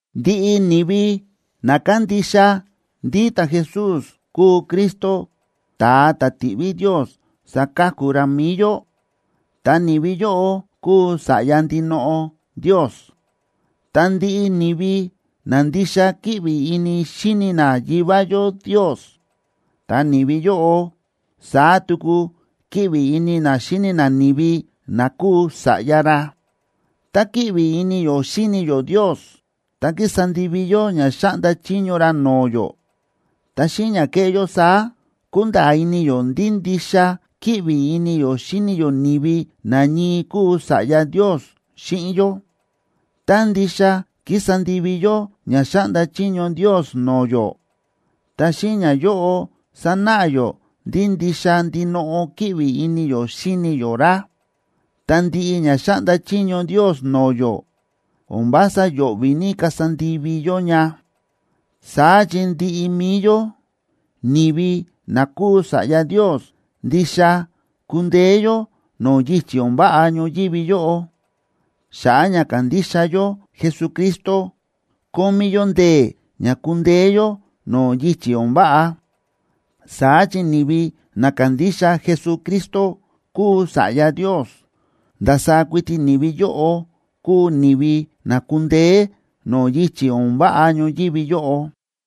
Ndiꞌi ni̱vi na kándixa ndí ta̱Jesús kúu Cristo, ta̱a ta̱ ti̱ꞌví Ndios saka̱ku ra mi̱i yó, ta ni̱vi yóꞌo kúu sa̱ꞌya ndinoꞌo Ndios. Ta ndiꞌi ni̱vi na ndixa kíꞌvi ini xíni na Yivá yó Ndios, ta ni̱vi yóꞌo, saá tuku kíꞌvi ini na xíni na ni̱vi na kúu sa̱ꞌya ra. Tá kíꞌvi ini yó xíni yó Ndios ta kísa ndivi yó ña xáꞌnda chiño ra no̱o̱ yó, ta xíꞌin ña kéꞌé yó saá, kúnda̱a̱ ini yó ndí ndixa kíꞌvi ini yó xíni yó ni̱vi na ñii kúu sa̱ꞌya Ndios xíꞌin yó. Tá ndixa kísa ndivi yó ña xáꞌnda chiño Ndios no̱o̱ yó, ta xíꞌin ñayóꞌo sánáꞌa yó ndí ndixa ndinoꞌo kíꞌvi ini yó xíni yó ra. Ta ndiꞌi ña xáꞌnda chiño Ndios no̱o̱ yó o̱n vása yo̱ꞌvi̱ ní kasa ndivi yó ña. Saá chi ndiꞌi mi̱i yó, ni̱vi na kúu sa̱ꞌya Ndios, ndixa kúndeé yó no̱o̱ yichi̱ o̱n váꞌa ñoyívi yóꞌo. Xa̱ꞌa̱ ña kándixa yó Jesucristo, kómí yó ndee̱ ña kúndeé yó no̱o̱ yichi̱ o̱n váꞌa. Saá chi ni̱vi na kándixa Jesucristo kúu Sa̱ꞌya Ndios, ndasaá kuiti ni̱vi yóꞌo kúu ni̱vi na kúndeé no̱o̱ yichi̱ o̱n váꞌa ñoyívi yóꞌo.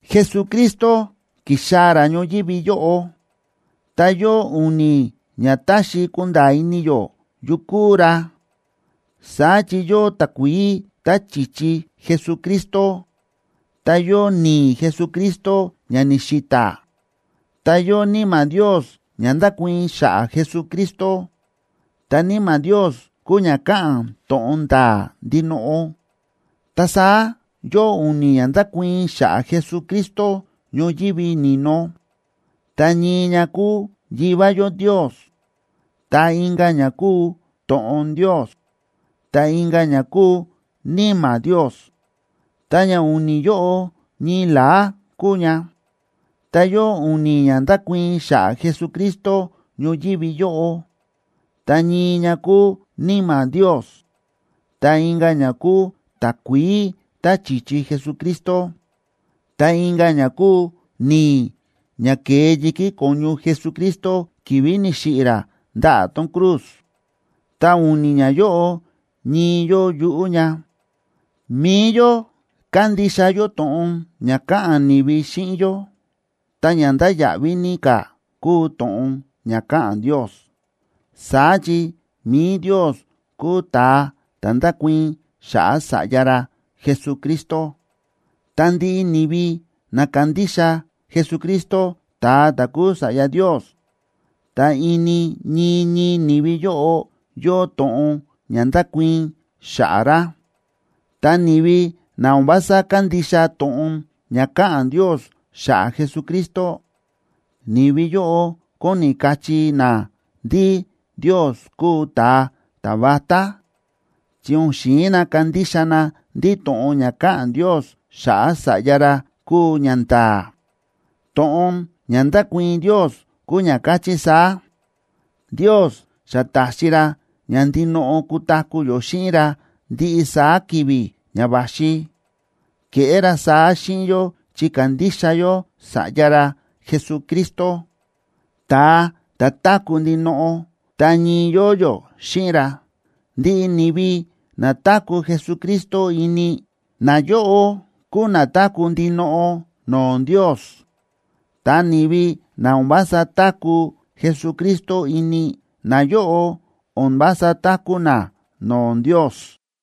Jesucristo ki̱xaa̱ ra ñoyívi yóꞌo, ta yóo u̱ni̱ ña táxi kunda̱a̱ ini yó yu kúu ra. Saá chi yóo takuií tá chi̱chi Jesucristo, ta yóo ni̱i̱ Jesucristo ña ni̱xi̱ta̱, ta yóo Níma̱ Ndios ña ndákuii̱n xa̱ꞌa̱ Jesucristo, ta Níma̱ Ndios kúu ña káꞌa̱n to̱ꞌon nda̱a̱ ndinoꞌo. Ta saá yóo u̱ni̱ ña ndákuii̱n xa̱ꞌa̱ Jesucristo ñoyívi ni̱no, ta ñii ña kúu Yivá yó Ndios, ta inka̱ ña kúu To̱ꞌon Ndios, ta inka̱ ña kúu Níma̱ Ndios, ta ña u̱ni̱ yóꞌo ñii la̱á kúu ña. Ta yóo u̱ni̱ ña ndákuii̱n xa̱ꞌa̱ Jesucristo ñoyívi yóꞌo, ta ñii ña kúu Níma̱ Ndios, ta inka̱ ña kúu takuií tá chi̱chi Jesucristo, ta inka̱ ña kúu ni̱i̱ ña ke̱e yi̱kí ko̱ñu Jesucristo ki̱vi̱ ni̱xiꞌi̱ ra ndaꞌa̱ tón cruz. Ta u̱ni̱ ñayóꞌo ñii yóo yuꞌú ña. Mi̱i yó kándixa yó to̱ꞌon ña káꞌa̱n ni̱vi xíꞌin yó, ta ña ndáya̱ꞌví ní ka̱ kúu to̱ꞌon ña káꞌa̱n Ndios. Saá chi mi̱i Ndios kúu ta̱a ta̱ ndákuii̱n xa̱ꞌa̱ Sa̱ꞌya ra Jesucristo. Ta ndiꞌi ni̱vi na kándixa Jesucristo ta̱a ta̱ kúu Sa̱ꞌya Ndios, ta ini ñii ñii ni̱vi yóꞌo yóo to̱ꞌon ña ndákuii̱n xa̱ꞌa̱ ra. Ta ni̱vi na o̱n vása kándixa to̱ꞌon ña káꞌa̱n Ndios xa̱ꞌa̱ Jesucristo, ni̱vi yóꞌo kóni kachí na ndí Ndios kúu ta̱a ta̱vatá, chi o̱n xi̱in na kandixa na ndí to̱ꞌon ña káꞌa̱n Ndios xa̱ꞌa̱ Sa̱ꞌya ra kúu ñanda̱a̱. To̱ꞌon ña ndákuii̱n Ndios kúu ña káchí saá: Ndios xa ta̱xi ra ña ndinoꞌo kutaku̱ yó xíꞌin ra ndiꞌi saá ki̱vi̱ ña va̱xi. Ke̱ꞌé ra saá xíꞌin yó chi kándixa yó Sa̱ꞌya ra Jesucristo, ta̱a ta̱ táku̱ ndinoꞌo, ta ñii yóo yó xíꞌin ra. Ndiꞌi ni̱vi na táku̱ Jesucristo ini, nayóꞌo kúu na táku̱ ndinoꞌo no̱o̱ Ndios. Ta ni̱vi na o̱n vása táku̱ Jesucristo ini, nayóꞌo o̱n vása táku̱ na no̱o̱ Ndios.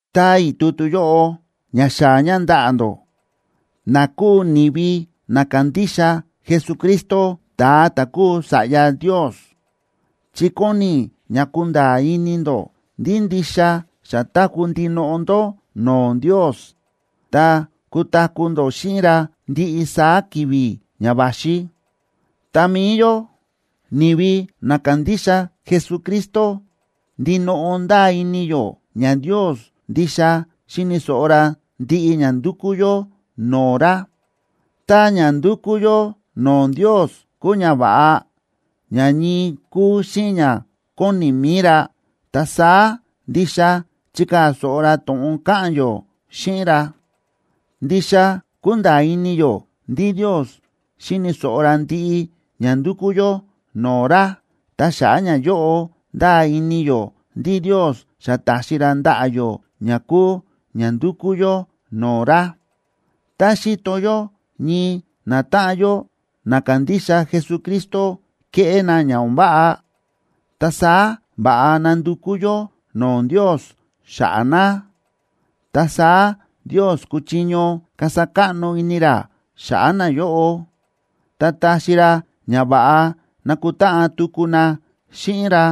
Táa i̱ tutu yóꞌo ña xaa̱ ña ndaꞌa̱ ndó, na kúu ni̱vi na kándixa Jesucristo, ta̱a ta̱ kúu Sa̱ꞌya Ndios, chi kóni i̱ ña kunda̱a̱ ini ndó ndí ndixa xa táku̱ ndinoꞌo ndó no̱o̱ Ndios, ta kutaku̱ ndó xíꞌin ra ndiꞌi saá ki̱vi̱ ña va̱xi. Ta mi̱i yó, ni̱vi na kándixa Jesucristo, ndinoꞌo ndáa ini yó ña Ndios ndixa xíni̱ so̱ꞌo ra ndiꞌi ña ndúkú yó no̱o̱ ra. Tá ña ndúkú yó no̱o̱ Ndios kúu ñava̱ꞌa, ña ñii kúu xíꞌin ña kóni mi̱i ra, ta saá ndixa chíkaa̱ so̱ꞌo ra to̱ꞌon káꞌa̱n yó xíꞌin ra. Ndixa kúnda̱a̱ ini yó ndí Ndios xíni̱ so̱ꞌo ra ndiꞌi ña ndúkú yó no̱o̱ ra, ta xa̱ꞌa̱ ñayóꞌo, ndáa ini yó ndí Ndios xa ta̱xi ra ndaꞌa̱ yó ña kúu ña ndúkú yó no̱o̱ ra. Tá xíto yó ñii natáꞌan yó na kándixa Jesucristo kéꞌé na ña o̱n váꞌa, ta saá va̱ꞌa ná ndukú yó no̱o̱ Ndios xa̱ꞌa̱ na. Ta saá Ndios kúchiño kasa káꞌno ini ra xa̱ꞌa̱ nayóꞌo, ta taxi ra ña va̱ꞌa nakutáꞌan tuku na xíꞌin ra.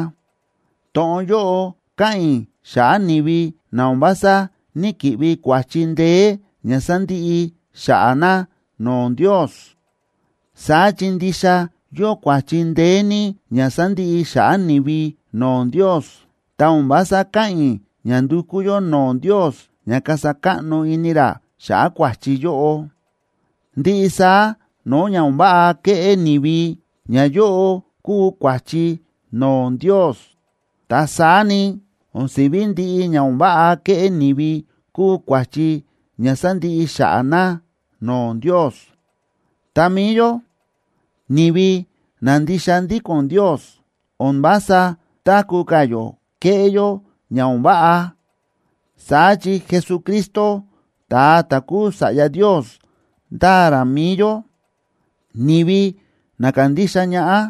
To̱ꞌon yóꞌo káꞌa̱n i̱ xa̱ꞌa̱ ni̱vi na o̱n vása ní‑kiꞌvi kua̱chi ndeé ña sandiꞌi xa̱ꞌa̱ na no̱o̱ Ndios. Saá chi ndixa yóo kua̱chi ndeé ní ña sandiꞌi xa̱ꞌa̱ ni̱vi no̱o̱ Ndios, ta o̱n vása káꞌa̱n i̱ ña ndukú yó no̱o̱ Ndios ña kasa káꞌno ini ra xa̱ꞌa̱ kua̱chi yóꞌo. Ndiꞌi saá no̱o̱ ña o̱n váꞌa kéꞌé ni̱vi, ñayóꞌo kúu kua̱chi no̱o̱ Ndios. Ta saá ni, o̱n si̱ví ndiꞌi ña o̱n váꞌa kéꞌé ni̱vi kúu kua̱chi ña sandiꞌi xa̱ꞌa̱ na no̱o̱ Ndios. Ta mi̱i yó, ni̱vi na ndixa ndíko̱n Ndios, o̱n vása táku̱ ka̱ yó kéꞌé yó ña o̱n váꞌa. Saá chi Jesucristo, ta̱a ta̱ kúu Sa̱ꞌya Ndios ndáa ra mi̱i yó, ni̱vi na kándixa ñaꞌá,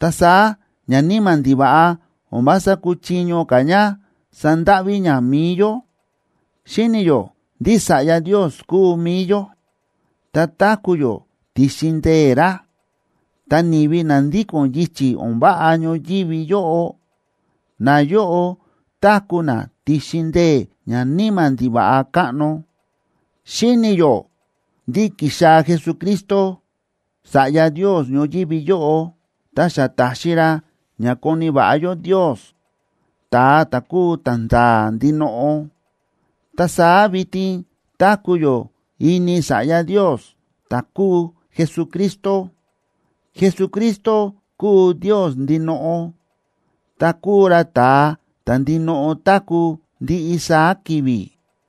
ta saá ñaníma̱ ndiva̱ꞌa o̱n vása kúchiño ka̱ ña sandáꞌví ña mi̱i yó. Xíni̱ yó ndí sa̱ꞌya Ndios kúu mi̱i yó, ta táku̱ yó ti̱xin ndee̱ ra. Ta ni̱vi na ndíko̱n yichi̱ o̱n váꞌa ñoyívi yóꞌo, nayóꞌo táku̱ na ti̱xin ndee̱ ñaníma̱ ndiva̱ꞌa káꞌno. Xíni̱ yó ndí ki̱xaa̱ Jesucristo Sa̱ꞌya Ndios ñoyívi yóꞌo, ta xa ta̱xi ra ña koni̱ va̱ꞌa yó Ndios ta̱a ta̱ kúu ta̱nda̱a̱ ndinoꞌo. Ta saá vitin táku̱ yó ini Sa̱ꞌya Ndios, ta̱ kúu Jesucristo. Jesucristo kúu Ndios ndinoꞌo, ta kúu ra ta̱a ta̱ ndinoꞌo táku̱ ndiꞌi saá ki̱vi̱.